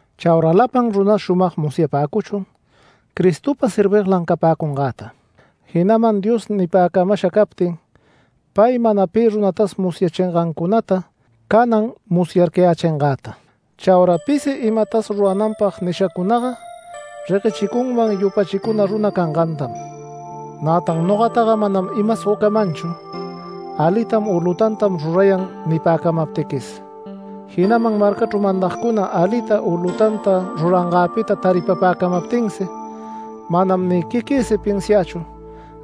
Chaura lapan runas shumag musyapäcuchun Cristopa serviglan capäcungäta. Jinaman Dios nipäcamasha captin pay mana pi runatas musyachingancunata canan musyarcayächingäta. Chaura pisi imatas rurananpag nishacunaga reguechicunman yupachicuna runa cangantam. Nätan nogataga manam imas gocamanchu “Alitam” u “Lutantam rurayan” nipäcamaptiquis, jinaman marcachru mandagcuna alita u lutanta rurangäpita taripapäcamaptinsi. Manam ni quiquïsi pinsiächu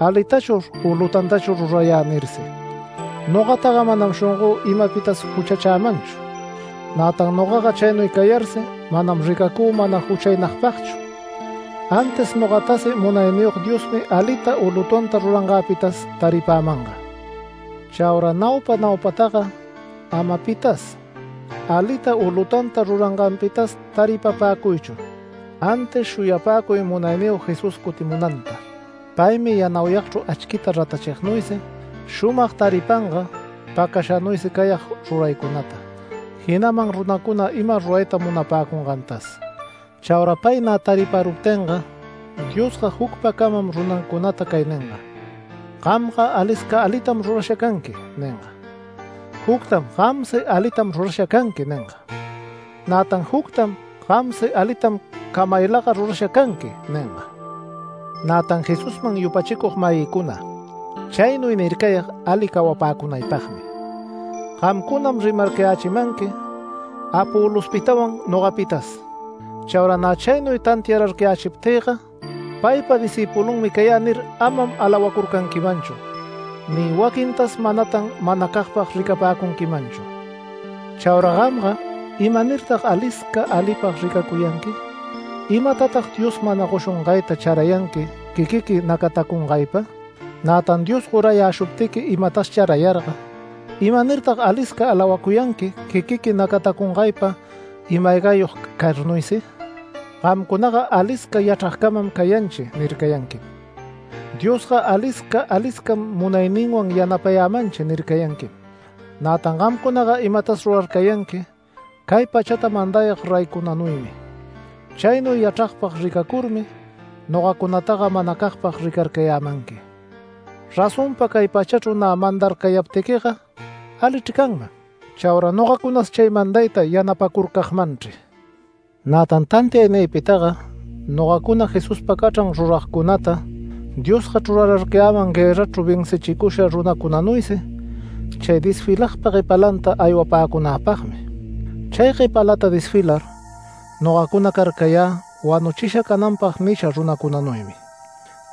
“Alitachur u lutantachur rurayä” nirsi. Nogataga manam shongö imapitas juchachämanchu. Nätan nogaga chaynuy cayarsi manam ricacü mana juchaynagpagchu, antis nogatasi Munayniyog Diosmi alita u lutanta rurangäpitas taripämanga. Chaura naupa naupataga ama pitas, alita u lutanta ruranganpitas taripapäcuychu, antis shuyapäcuy Munayniyog Jesús cutimunanta. Paymi yanauyagchru achquita ratachignuysi shumag taripanga pacashanuysi cayag ruraycunata, jinaman runacuna ima rurayta munapäcungantas. Chaura pay nä tariparuptinga Diosga jucpacamam runancunata cay ninga: “Gamga alisca alitam rurasha canqui” ninga. Juctam “Gamsi alitam rurasha canqui” ninga. Nätan juctam “Gamsi alitam camaylaga rurasha canqui” ninga. Nätan Jesusman yupachicug-mayïcuna, chaynuy nircayag ali cawapäcunaypagmi. Gamcunam rimarcayächimanqui Apolospitawan nogapitas. Chaura nä chaynuy tantiararcayächiptïga “Paypa discïpulunmi cayä” nir, amam alawacurcanquimanchu ni waquintas manatan manacagpag ricapäcunquimanchu. Chaura gamga ¿imanirtag alisca alipag ricacuyanqui? ¿Imatatag Dios mana goshungayta charayanqui quiquiqui nacatacungaypa? Nätan Dios gorayäshuptiqui imatas charayarga ¿imanirtag alisca alawacuyanqui quiquiqui nacatacungaypa ima-aygayog carnuysi? Gamcunaga “Alisca yachragcamam cayanchi” nircayanquim, “Diosga alisca aliscam munayninwan yanapayämanchi” nircayanquim. Nätan gamcunaga imatas rurarcayanqui cay pachata mandayag reycunanuymi. Chaynuy yachragpag ricacurmi nogacunataga manacagpag ricarcayämanqui. Razonpa cay pachachru nä mandarcayaptiquiga alichr canman. Chaura nogacunas chay mandayta yanapacurcagmanchri. Nätan tantiaynïpitaga, nogacuna Jesuspa cachran ruragcunata Diosga chrurarcayäman guërrachru vencichicusha runacunanuysi chay desfilagpa guepalanta aywapäcunäpagmi. Chay guepalata desfilar nogacuna carcayä wanuchisha cananpag nisha runacunanuymi.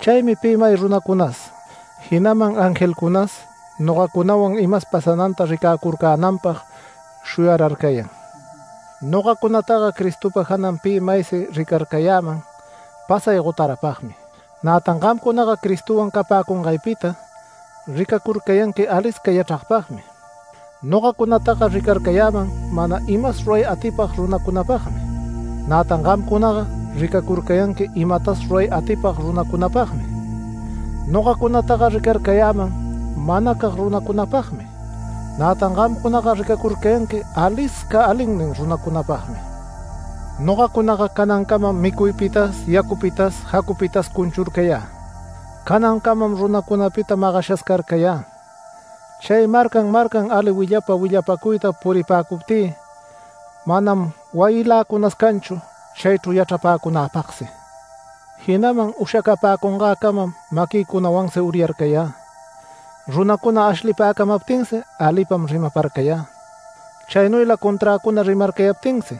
Chaymi pi may runacunas, jinaman angelcunas nogacunawan imas pasananta ricäcurcänanpag shuyararcayan. Nogacunataga Cristopa janan pi maysi ricarcayäman pasay gotarapagmi. Nätan gamcunaga Cristowan capäcungaypita ricacurcayanqui alisca yachragpagmi. Nogacunataga ricarcayäman mana imas ruray atipag runacunapagmi. Nätan gamcunaga ricacurcayanqui imatas ruray atipag runacunapagmi. Nogacunataga ricarcayäman manacag runacunapagmi, nätan gamcunaga ricacurcayanqui alisca alinnin runacunapagmi. Nogacunaga canancamam micuypitas yacupitas jacupitas cunchurcayä. Canancamam runacunapita magashas carcayä, chay marcan marcan ali willapa willapacuyta puripäcuptï manam wayïlacunas canchu chaychru yachrapäcunäpagsi. Jinaman ushacapäcungäcamam maquïcunawansi uryarcayä. Runacuna ashlipäcamaptinsi alipam rimaparcayä. Chaynuyla conträcuna rimarcayaptinsi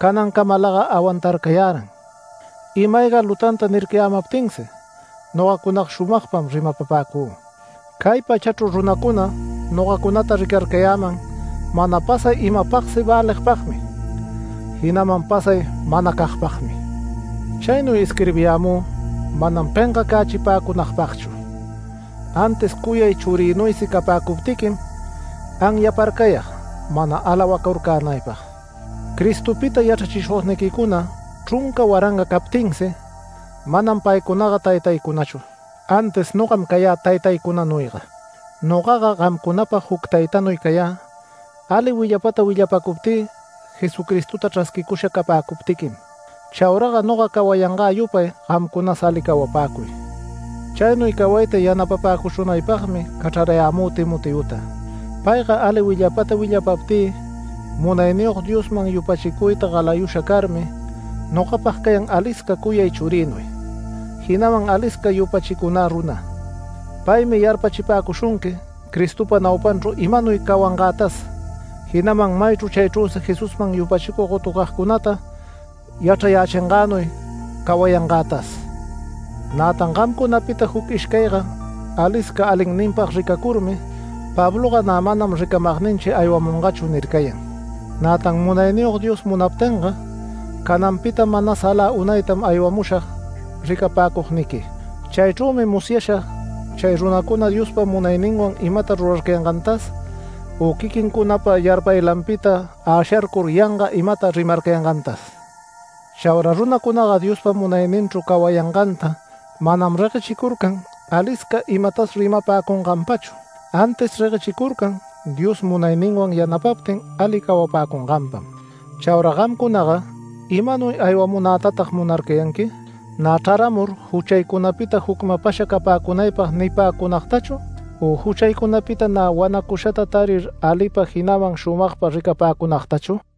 canancamalaga awantarcayäran. Ima-ayga lutanta nircacayämaptinsi nogacunaga shumagpam rimapapäcü. Cay pachachru runacuna nogacunata ricarcayäman mana pasay imapagsi väligpagmi, jinaman pasay manacagpagmi. Chaynuy isquirbiyämü manam pengacachipäcunagpagchu antis cuyay churïnuysi capäcuptiquim anyaparcayag mana alawacurcänaypag. Cristopita yachrachishugniquicuna chrunca waranga captinsi, manam paycunaga taytaycunachu, antis nogam cayä taytaycunanuyga. Nogaga gamcunapag juc taytanuy cayä, ali willapata willapapäcuptï Jesucristota chrasquicusha capäcuptiquim. Chauraga noga cawayangä yupay gamcunas ali cawapäcuy. Chaynuy cawayta yanapapäcushunaypagmi cachrarayämü Timoteota. Payga ali willapata willapaptï Munayniyog Diosman yupachicuyta galayusha carmi nogapag cayan alisca cuyay churïnuy, jinaman alisca yupachicunä runa. Paymi yarpachipäcushunqui Cristopa naupanchru imanuy cawangätas, jinaman maychru chaychrüsi Jesusman yupachicug gotucagcunata yachrayächingänuy cawayangätas. Nätan gamcunapita juc ishcayga alisca alinninpag ricacurmi “Pabloga nä manam ricamagninchi aywamungachu” nircayan. Nätan Munayniyog Dios munaptinga cananpita manas alä unaytam aywamushag ricapäcugniqui. Chaychrümi musyashag chay runacuna Diospa munayninwan imata rurarcayangantas u quiquincunapa yarpaylanpita äsharcur yanga imata rimarcayangantas. Chaura runacunaga Diospa munayninchru cawayanganta manam reguechicurcan alisca imatas rimapäcunganpachu, antis reguechicurcan Dios munayninwan yanapaptin ali cawapäcunganpam. Chaura gamcunaga ¿imanuy aywamunätatag munarcayanqui? Nä chraramur juchaycunapita jucmapasha capäcunaypag nipäcunagtachu, u ¿juchaycunapita nä wanacushata tarir alipa, jinaman shumagpa ricapäcunagtachu?